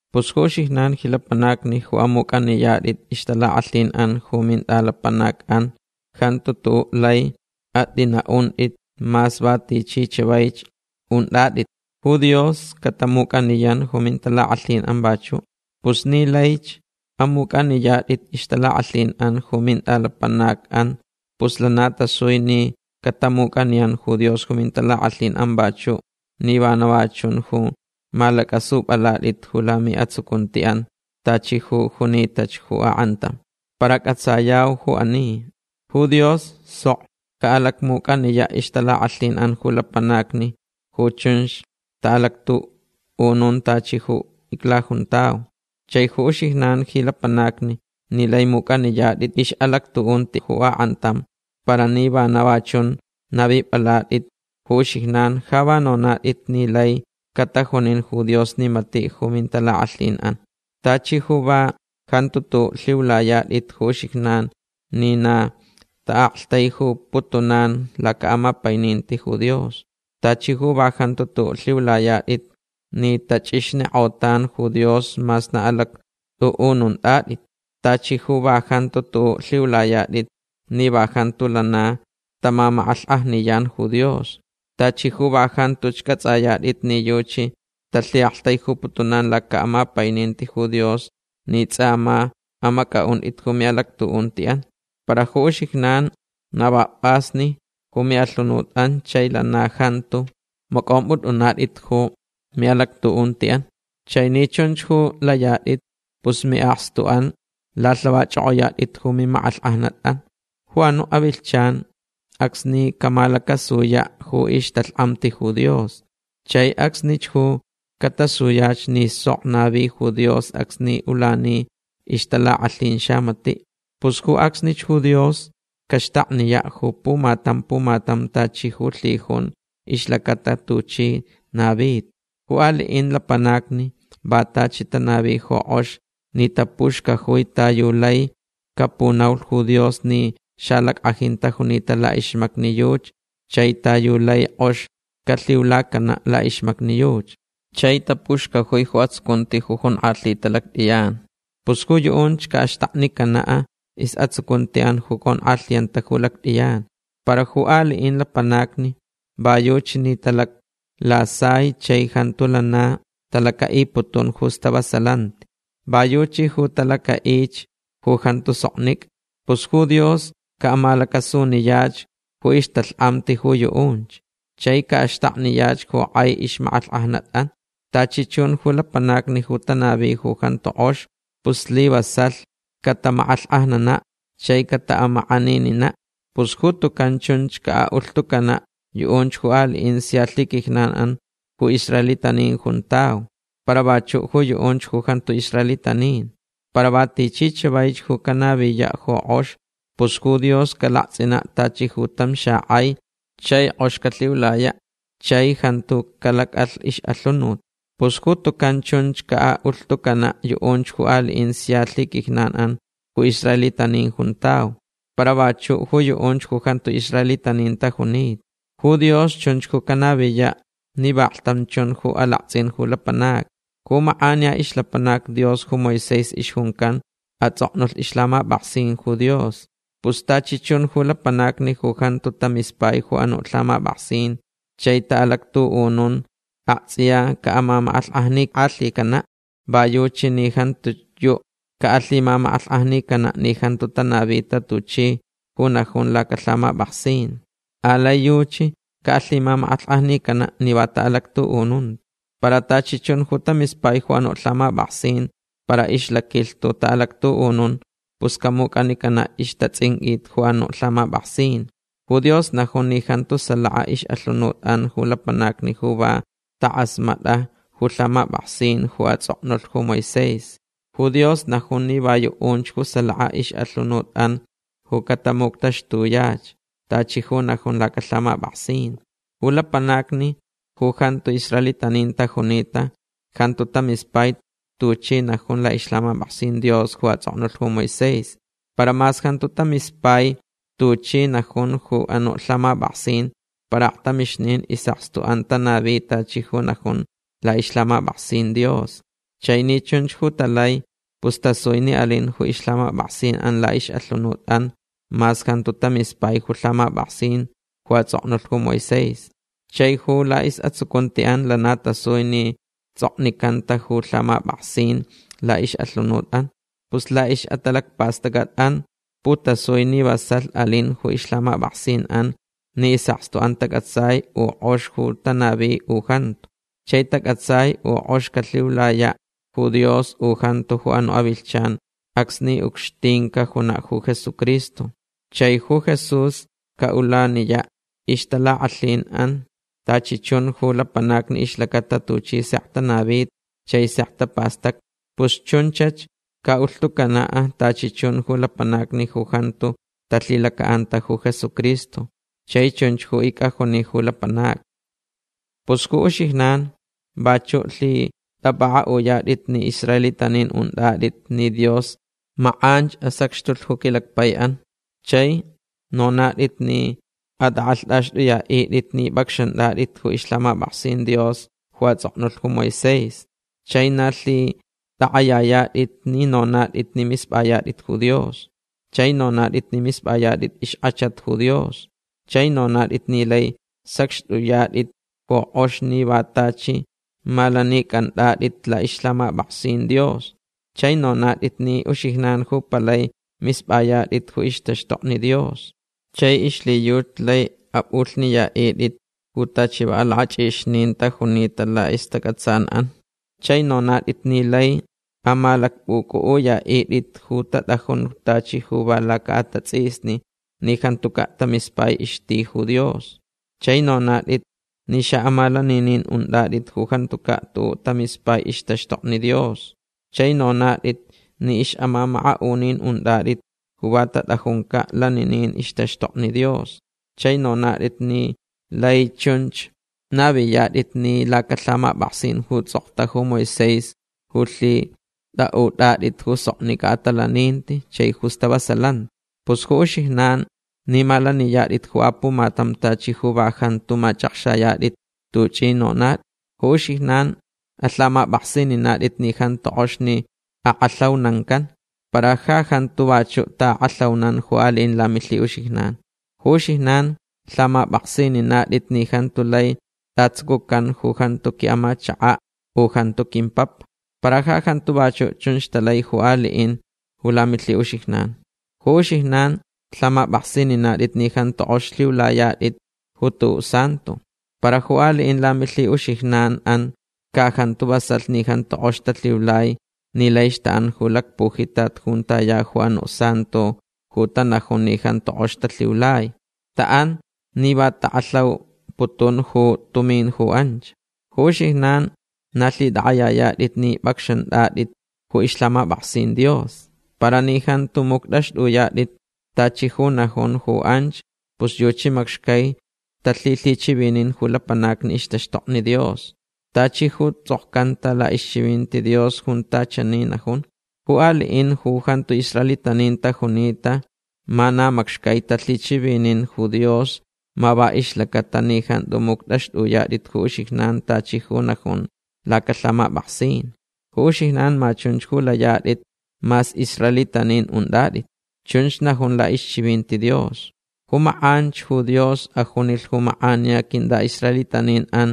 Pus ju uxijnan ji lapanacni ju amuc'aniyat'it ixtalak'alhin'an ju mint'alapanac'an jantu tu'u' lai at'ina'unt'it mas va tichi chavaich unt'at'it. Ju Dios catamuc'aniyan ju mintalak'alhin'an vachu'. Pus ni laich amuc'aniyat'it ixtalak'alhin'an ju mint'alapanac'an pus lana tasui ni catamuc'aniyan ju Dios ju mintalak'alhin'an vachu' ni vana va chun ju malac'asup'alat'it ju lami'atsucunti'an tachi ju junitach ju ak'antam. Para c'atsayau ju ani. Ju Dios sok ca'alacmuc'aniya' ixtalak'alhin'an ju lapanacni ju chunch ta'alactu'unun tachi ju iclajuntau. Chai ju uxijnan ji lapanacni ni lai muc'aniyat'it ix'alactu'unti ju ak'antam para ni vana va chun navip'alat'it ju uxijnan ja va nonat'it ni lai catajunin ju Dios ni mati' ju mintalak'alhin'an. Tachi ju va jantu tu'u' lhiulayat'it ju uxijnan ni na ta'aktaijuputunan laca'amapaininti ju Dios. Tachi ju va jantu tu'u' lhiulayat'it ni tach'ixnik'otan ju Dios mas na alact'u'ununat'it. Tachi ju va jantu tu'u' lhiulayat'it ni va jantu lana tamamak'alhk'ajniyan ju Dios. Tachi ju va jantuch c'ats'ayat'it ni yuchi talhi'aktaijuputunan laca'amapaininti ju Dios ni ts'a ma amac'a'unt'it ju mi'alactu'unti'an. Para ju uxijnan na va p'asnich ju mi'alhunut'an chai lana jantu mac'omp'ut'unat'it ju mi'alactu'unti'an. Chai ni chunch ju layat'it pus mi'akstu'an lalhavach'ok'oyat'it ju mimak'alhk'ajnat'an ju anu' avilhchan acsni camalacasuyach ju ixtalhk'amti ju Dios. Chai acsnich ju catasuyach ni sok navi ju Dios acsni ulani ixtalak'alhin xamati'. Pus ju acsnich ju Dios caxtakniya' ju pumatam pumatam tachi ju lhijunch ixlacata ju tuchi navita. Ju ali'in lapanacni va tachi tanavi ju k'ox ni tapuxcajui ta yu laich capunaulh ju Dios ni xalack'ajin tajunita la'ixmacni yuchi chai ta yu laich k'ox calhiulacana' la'ixmacni yuchi. Chai tapuxcajui ju atsucunti ju jonk'alhita lact'iyan. Pus ju yu'unch ca'axtaknicana' is'atsucunti'an ju conk'alhiyanta ju lact'iyan. Para ju ali'in lapanacni va yuchi ni talaclasai chai jantu lana talaca'iputun ju stavasalanti. Va yuchi ju talaca'ich ju jantu soknic'a. Pus ju Dios ca'amalacasuniyach ju ixtalhk'amti ju yu'unch. Chai ca'axtakniyach ju k'ai ixmak'alhk'ajnat'an. Tachi chun ju lapanacni ju tanavich ju jantu k'ox pus slivasalh catamak'alhk'ajnana' chai cata'amak'aninina'. Pus ju tucan chunch ca'a'ulhtucana' yu'unch ju ali'in sia lhiquijnan'an ju israelitanin juntau. Para vachu' ju yu'unch ju jantu israelitanin. Para va tichi chavaich ju canaviya' ju k'ox pus ju Dios calakts'ina' tachi ju tam xak'ai chai k'ox calhiulaya' chai jantu calac'alh ix'alhunut. Pus ju tucan chunch ca'a'ulhtucana' yu'unch ju ali'in sia lhiquijnan'an ju israelitanin juntau. Para vachu' ju yu'unch ju jantu israelitanin tajunita. Ju Dios chunch ju canaviya' ni vaklhtam chun ju alakts'in ju lapanacni. Ju mak'aniya ixlapanac Dios ju Moisés ixjuncan ats'oknulh ixlhamap'aksin ju Dios. Pus tachi chun ju lapanacni ju jantu tamispai ju anu' lhamap'aksin chai ta'alactu'unun akts'iya ca'amamak'alhk'ajnik'alhicana'. Va yuchi ni jantiyu' ca'alhimamak'alhk'ajnicana' ni jantu tanavita tachi ju najun lacalhamap'aksin. Alai yuchi ca'alhimamak'alhk'ajnicana' ni va ta'alactu'ununta. Para tachi chun ju tamispai ju anu' lhamap'aksin para ixlaquilhtu ta'alactu'unun pus camuc'anicana' ixtats'inq'uit ju anu' lhamap'aksin. Ju Dios najun ni jantu salaka ix'alhunut'an ju lapanacni ju va tak'asmat'a ju lhamap'aksin ju ats'oknulh ju Moisés. Ju Dios najun ni va yu'unch ju salaka ix'alhunut'an ju catamuctaxtuyach tachi ju najun lacalhamap'aksin. Ju lapanacni ju jantu israelitanin tajunita jantu tamispai tuchi najun la'ixlhamap'aksin Dios ju ats'oknulh ju Moisés. Para mas jantu tamispai tuchi najun ju anu' lhamap'aksin para aktamixnin is'akstu'an tanavi tachi ju najun la'ixlhamap'aksin Dios. Chai ni chunch ju talai pus tasui ni alin ju ixlhamap'aksin'an la'ix'alhunut'an mas jantu tamispai ju lhamap'aksin ju ats'oknulh ju Moisés. Chai ju la'is'atsucunti'an lana tasui ni ts'oknicanta ju lhamap'aksin la'ix'alhunut'an. Pus la'ix'atalacpast'ac'at'an putasui ni vasalh alin ju ixlhamap'aksin'an ni is'akstu'an tac'atsai u k'ox ju tanavi u jantu. Chai tac'atsai u k'ox calhiulaya' ju Dios u jantu ju anu' avilhchan acsni ucxtin cajuna' ju Jesucristo. Chai ju Jesús ca'ulaniya' ixtalak'alhin'an tachi chun ju lapanacni ixlacata tuchi sek tanavita chai sek tapastacta. Pus chunchach ca'ulhtucana' tachi chun ju lapanacni ju jantu talhilaca'anta ju Jesucristo. Chai chunch ju ic'ajuni ju lapanacni. Pus ju uxijnan vachu' lhit'ap'ak'a'uyat'it ni israelitanin unt'at'it ni Dios mak'anch asacxtulh ju quilacpai'an. Chai nonat'it ni at'ak'alht'axt'uya'it'it ni p'acxant'at'it ju ixlhamap'aksin Dios ju ats'oknulh ju Moisés. Chai na lhit'ak'ayayat'it ni nonat'it ni misp'ayat'it ju Dios. Chai nonat'it ni misp'ayat'it ixk'achat ju Dios. Chai nonat'it ni lai sacxt'uyat'it ju k'ox ni va tachi malanic'ant'at'it la'ixlhamap'aksin Dios. Chai nonat'it ni uxijnan ju palai misp'ayat'it ju ixtaxtokni Dios. Chai ixlhiyuchi laich ap'ulhniya'it'it ju tachi va alak'ach'ixnin tajunita la'istac'atsan'an. Chai nonat'it ni laich amalacp'uc'u'uya'it'it ju tat'ajun tachi ju va laca'atats'isni ni jantuca' tamispai ixti ju Dios. Chai nonat'it ni xa'amalaninin unt'at'it ju jantuca' tu'u' tamispai ixtaxtokni Dios. Chai nonat'it ni ix'amamaka'unin unt'at'it ju va tat'ajunca' laninin ixtaxtokni Dios. Chai nonat'it ni lai chun naviyat'it ni lacalhamap'aksin ju ts'okta ju Moisés ju lhit'a'ut'at'it ju soknic'a atalaninti chai ju stavasalanti. Pus ju uxijnan ni malaniyat'it ju apumatam tachi ju va jantu mach'akxayat'it tuch'i nonat'it. Ju uxijnan alhamap'aksininat'it ni jantu k'ox ni ak'alhaunancanch. Para ja jantu vachu' ta'ak'alhaunan ju ali'in lamilhi'uxijnan'an. Ju uxijnan lhamap'aksininat'it ni jantu lai t'atsucucan ju jantu qui'amachaka' u jantu quimpapa. Para ja jantu vachu' chunch talai ju ali'in ju lamilhi'uxijnan. Ju uxijnan lhamap'aksininat'it ni jantu k'ox lhiulayat'it ju tu'u' santo. Para ju ali'in lamilhi'uxijnan'an ca jantu vasalh ni jantu k'ox talhiulai ni laich ta'an ju lacpujitat junta ya ju anu' santo ju tanajun ni jantu k'ox talhiulai. Ta'an ni va tak'alhauputun ju tumin ju anch. Ju uxijnan na lhit'ak'ayayat'it ni p'acxant'at'it ju ixlhamap'aksin Dios. Para ni jantu muct'axt'uyat'it tachi ju najun ju anch pus yuchi macxcai talhilhichivinin ju lapanacni ixtaxtokni Dios. Tachi ju ts'okcanta la'ixchivinti Dios junta chani najun: “Ju ali'in ju jantu israelitanin tajunita ma va macxcai talhichivinin ju Dios ma va ixlacata ni jantu muct'axt'uyat'it ju uxijnan tachi ju najun lacalhamap'aksin. Ju uxijnan ma chunch ju layat'it mas israelitanin unt'at'it”. Chunch najun la'ixchivinti Dios. Ju mak'anch ju Dios ajunilh ju mak'aniya quint'a'israelitanin'an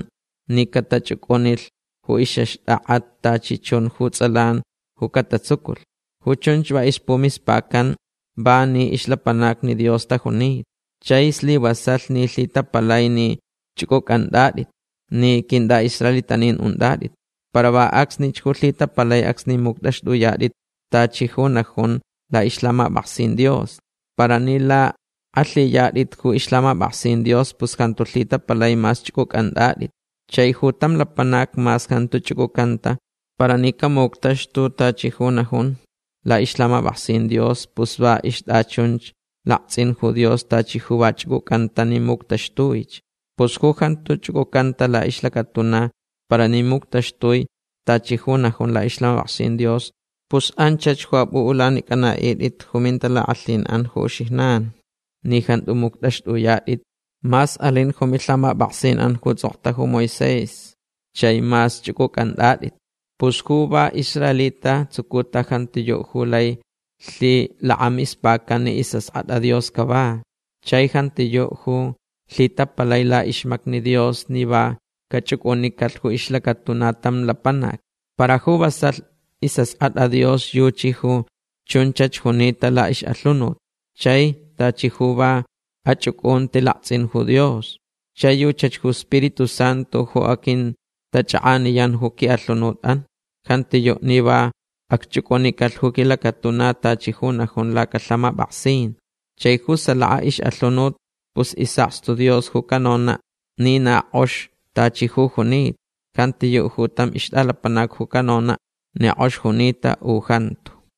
ni catach'uc'unilh ju ix'axt'ak'a tachi chun ju ts'alan ju catatsuculh. Ju chunch va ixpumispacanch va ni ixlapanacni Dios tajunita. Chai slivasalh ni lhitapalai ni ch'uc'uc'ant'at'itch ni quint'a'israelitanin unt'at'it. Para va acsnich ju lhitapalai acsni muct'axt'uyat'it tachi ju najun la'ixlhamap'aksin Dios. Para ni lak'alhiyat'it ju ixlhamap'aksin Dios pus jantu lhitapalai mas ch'uc'uc'ant'at'it. Chai ju tam lapanac mas jantu ch'uc'ucanta para ni camuctaxtulh tachi ju najun la'ixlhamap'aksin Dios pus va ixt'achunch lakts'in ju Dios tachi ju va ch'uc'ucanta ni muctaxtuich. Pus ju jantu ch'uc'ucanta la'ixlacatuna para ni muctaxtui tachi ju najun la'ixlhamap'aksin Dios pus anchach ju ap'u'ulanic'ana'it'it ju mintalak'alhin'an ju uxijnan ni jantu muct'axt'uyat'it mas alinch ju milhamap'aksin'an ju ts'okta ju Moisés chai mas ch'uc'uc'ant'at'it. Pus ju va israelita tsucuta jantiyu' ju lai lhilakamispacan ni is'ask'at'a Dios cava. Chai jantiyu' ju lhitapalai la'ixmacni Dios ni va cach'uc'unicalh ju ixlacatuna tam lapanac. Para ju vasalh is'ask'at'a Dios yuchi ju chunchach junita la'ix'alhunut. Chai tachi ju va ach'uc'unti lakts'in ju Dios. Chai yuchach ju Spiritu Santu ju aquintach'ak'aniyan ju qui'alhunut'an. Jantiyu' ni va acch'uc'ucalh ju quilacatuna tachi ju najun lacalhamap'aksin. Chai ju salaka ix'alhunut pus is'akstu Dios ju canona' ni na k'ox tachi ju junita. Jantiyu' ju tam ixt'alapanac ju canona' ni k'ox junita u jantu.